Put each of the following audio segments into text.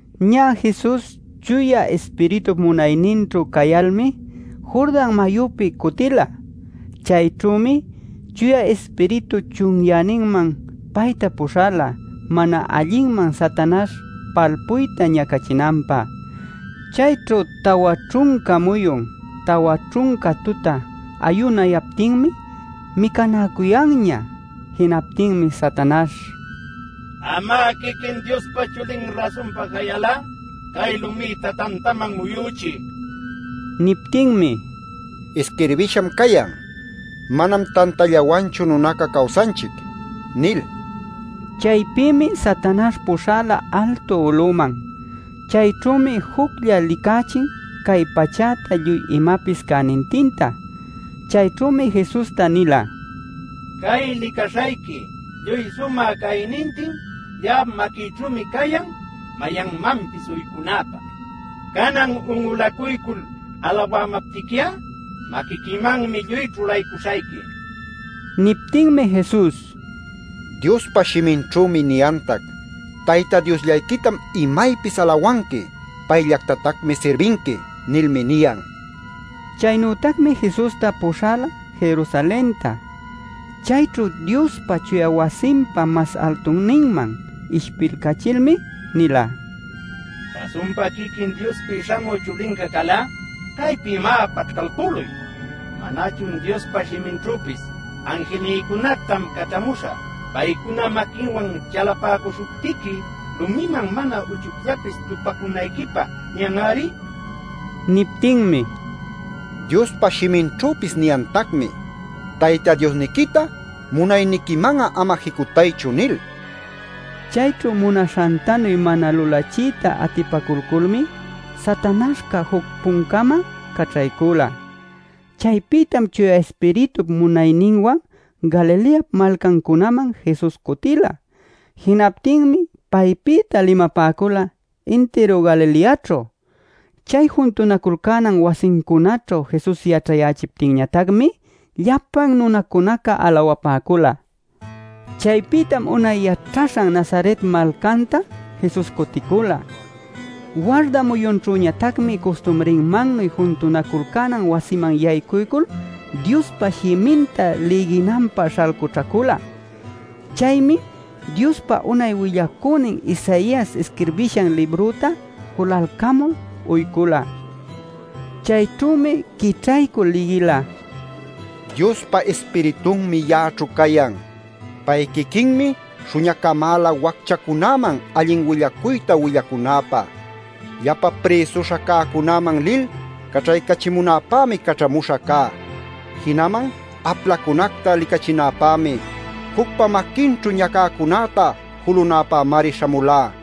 Ñä Jesus Chuya Ispiritup munayninćhu cayalmi Jordan mayupi cutila. Chayćhümi Chuya Ispiritu chunyäninman payta puśhala mana allinman Satanaśh palpuyta ñacachinanpä. Chayćhu tawa ćhunca muyun, tawa ćhunca tuta ayunaptinmi micanäcuyanña. Jinaptinmi Satanaśh: “Am'a quiquin Diospa Chulin rasunpa cayal'a cay lumïta tantaman muyuchiy” nila. Niptinmi: “Isquirbisham cayan: ‘Manam tantallawanchu nunaca cawsanchic’ nil” nila. Chaypïmi Satanaśh puśhala altu uluman. Chayćhümi juclla licächin cay pachäta lluy imapis cänintinta. Chayćhümi Jesusta nila: “Cay licaśhayqui lluy sumä caynintin ya'ap maquïćhümi cayan mayanmanpis uycunäpä. Canan un'ulacuycul alawamaptiqui'a maquiquimanmi lluy ćhulaycuśhayqui” nil. Niptinmi Jesus: “Diospa shiminćhümi niyantac: ‘Tayta Diosllayquitam imaypis alawanqui; payllactatacmi sirbinqui’ nilmi niyan” niycülun. Chaynütacmi Jesusta puśhala Jerusalenta. Chayćhu Diospa chuya wasinpa mas altunninman ishpilcachilmi nila: “Rasunpa quiquin Diospi śhamü Chulinca cal'a caypi, má, paćhcalpüluy. “¿Manachun Diospa shiminćhüpis: ‘Anjilnïcunactam caćhamuśhä paycuna maquinwan chalapäcuśhuptiqui lumiman mana uchucllapis tupacunayquipä’ niyan-ari?” nil. Niptinmi: “Diospa shiminćhüpis niyantacmi: ‘Tayta Diosniquita munayniquiman'a ama jicutaychu’ nil” niycülun. Chayćhu munaśhantanu mana lulachiyta atipaculculmi Satanaśhca juc-puncama caćhaycula. Chaypïtam Chuya Ispiritup munayninwan Galileap malcancunaman Jesus cutila. Jinaptinmi paypïta limapäcula intiru Galileaćhu. Chay juntunaculcänan wasincunäćhu Jesus yaćhayächiptinñatacmi llapan nunacunaca alawapäcula. Chaypïtam unay yaćhaśhan Nazaret malcanta Jesus cuticula. Warda muyunćhüñatacmi custumrinmannuy juntunaculcänan wasiman yaycuycul Diospa shiminta lïginanpä śhalcućhacula. Chaymi Diospa unay willacünin Isaias isquirbishan librüta julalcamul uycula. Chayćhümi quićhaycul lïgila: “Diospa Ispiritunmi ya'aćhu cayan. Pay quiquinmi śhuñacamäla wacchacunäman allin willacuyta willacunäpä. Llapa prïsuśha cäcunaman lil caćhaycachimunäpämi caćhamuśha cá. Jinaman aplacunacta licachinäpämi. Jucpa maquincunaćhu ñacäcunäta julunäpämari śhamulá.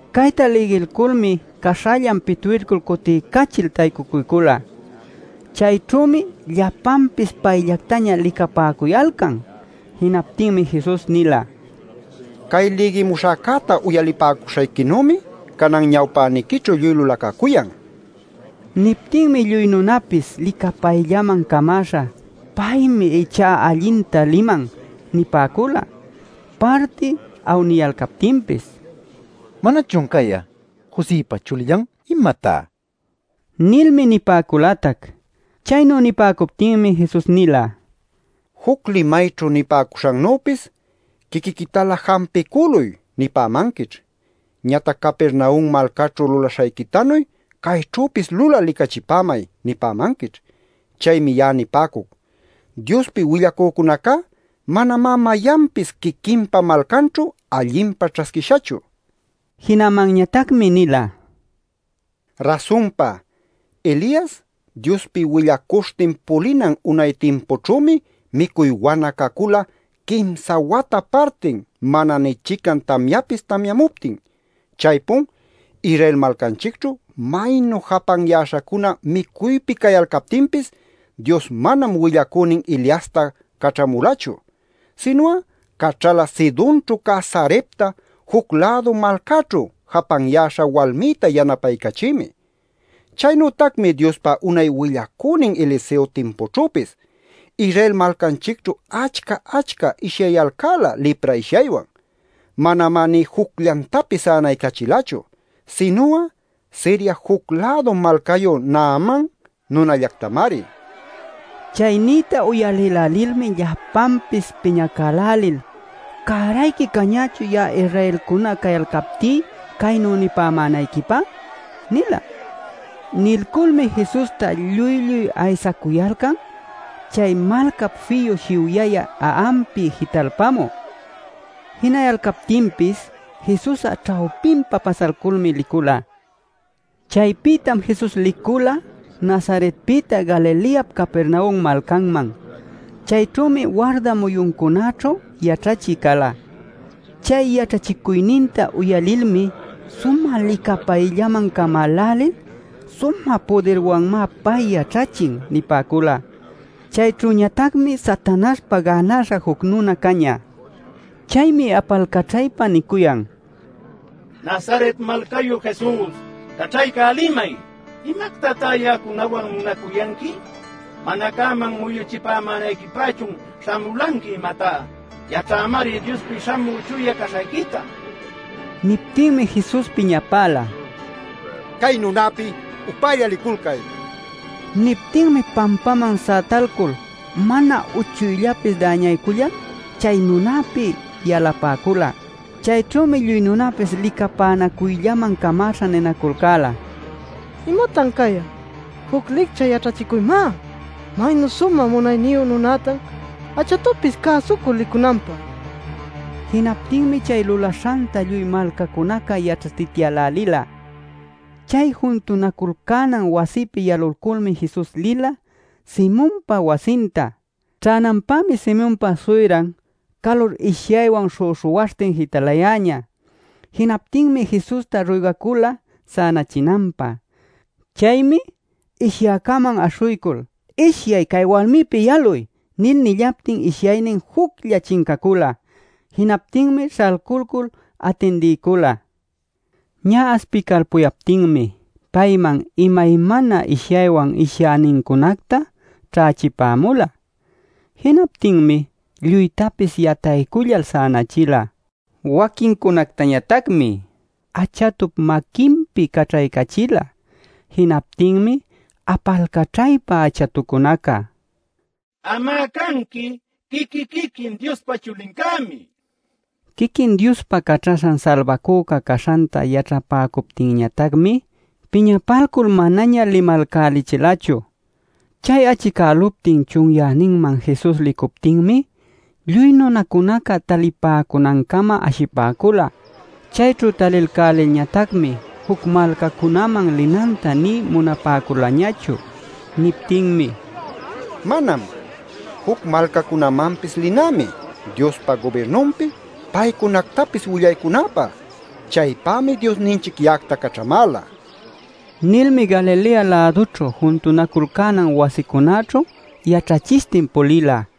Cayta lïgilculmi caśhallan pitwilcul cutiycachil taycucuycula. Chayćhümi llapanpis payllactaña licapäcuyalcan. Jinaptinmi Jesus nila: “Cay lïgimuśhäcäta uyalipäcuśhayquinümi canan ñawpäniquićhu lluy lulacacuyan” nil. Niptinmi lluy nunapis licapayllaman camäśha “Paymi ichá allinta liman” nipäcula. Parti awniyalcaptinpis: “¿Manachun cay'a Josëpa chulillan, imatá?” nilmi nipäculatac. Chaynu nipäcuptinmi Jesus nila: “Juc limayćhu nipäcuśhannüpis: ‘Quiquiquitalä jampicüluy’ nipämanquićh. Ñatac ‘Capernaum malcaćhu lulaśhayquitanuy cayćhüpis lulal licachipämay’ nipämanquićh. “Chaymi ya'a nipäcuc: Diospi willacücunacá manamá mayanpis quiquinpa malcanćhu allinpa ćhasquishachu” nil. Jinamanñatacmi nila: “Rasunpa, Elias Diospi willacuśhtin pulinan unay timpućhümi micuy wana cacula quimsa wata partin mana nï chican tamyapis tamyamuptin. Chaypun Israel malcanchicćhu maynu japanyäśhacuna micuypi cayalcaptinpis Dios manam willacünin Eliasta caćhamulachu. Sinu'a caćhala Sidonćhu cä Sarepta juc-lädu malcäćhu japanyäśha walmïta yanapaycachïmi. Chaynütacmi Diospa unay willacünin Eliseo timpućhüpis Israel malcanchicćhu achca-achca ishyayalcäla lipra ishyaywan. Manamá nï jucllantapis sänaycachilachu. Sinu'a Siria juc-lädu malcayu Naaman nunallactamari” nila. Chay niyta uyalïlälilmi llapanpis piñacälälil: “¡Cärayqui cañächun ya'a Israelcuna cayalcaptí caynu nipämänayquipä!” nila. Nilculmi Jesusta lluy-lluy aysacuyalcan chay malcap fiyu shiwyayä a'anpi jitalpamü. Jinayalcaptinpis Jesus'a ćhawpinpa pasalculmi licula. Chaypïtam Jesus licula Nazaretpïta Galileap Capernaum malcanman. Chayćhümi warda muyuncunaćhu yaćhachï cala. Chay yaćhachicuyninta uyalilmi sumä licapayllaman camälälil: “Sumä pudirwanmá pay yaćhachin” nipäcula. Chayćhüñatacmi Satanaśhpa gänaśha juc nuna cañä. Chaymi apalcaćhaypa nicuyan: “¡Nazaret malcayu, Jesus! ¡Caćhaycälimay! ¿Imactatá ya'acunawan munacuyanqui? ¿Mana cäman muyuchipämänayquipächun śhamulanqui, imatá? Yaćhämari Diospi Śhamü Chuya caśhayquita” nil. Niptinmi Jesus piñapäla: “¡Cay nunäpi upälla liculcay!” nil. Niptinmi pampäman sätalcul mana uchucllapis däñaycullal chay nunäpi yalapäcula. Chayćhümi lluy nunapis licapänacuyllaman camäśha ninaculcäla: “¡Imatan cay'a! ¡Juc licchä yaćhachicuymá! ¡Maynu sumä munayniyu nunatan achatupis cäsucul licunanpä!” nil. Jinaptinmi chay lulaśhanta lluy malcacunaca yaćhatityälälila. Chay juntunaculcänan wasipi yalulculmi Jesus lila Simonpa wasinta. Ćhänanpämi Simonpa suyran calur ishyaywan śhüśhuwaśhtin jitalayäña. Jinaptinmi Jesusta ruygacula sänachinanpä. Chaymi ishyäcäman aśhuycul “Ishyay, cay walmipi yaluy” nil nillaptin ishyaynin juclla chincacula. Jinaptinmi śhalculcul atindiycula. Ñä aspicalpuyaptinmi payman imaymana ishyaywan ishyänincunacta ćhächipämula. Jinaptinmi lluytapis yataycullal sänachila. Waquincunactañatacmi achatup maquinpi caćhaycachila. Jinaptinmi apalcaćhaypa achatucunaca: “¡Am'a canqui quiqui-quiquin Diospa Chulincämi!” nila. Quiquin Diospa Caćhaśhan Salbacüca caśhanta yaćhapäcuptinñatacmi piñapalcul manaña limalcachilachu. Chay achicäluptin chunyäninman Jesus licuptinmi lluy nunacunaca talipäcunancama ashipäcula. Chayćhu talilcälilñatacmi juc malcacunaman linanta nï munapäculañachu. Niptinmi: “Manam. Juc malcacunamanpis linämi, Diospa gubirnunpi paycunactapis willaycunäpä. Chaypämi Diosninchic ya'acta caćhamäla” nila. Nilmi Galilea-lädućhu juntunaculcänan wasicunaćhu yaćhachishtin pulila.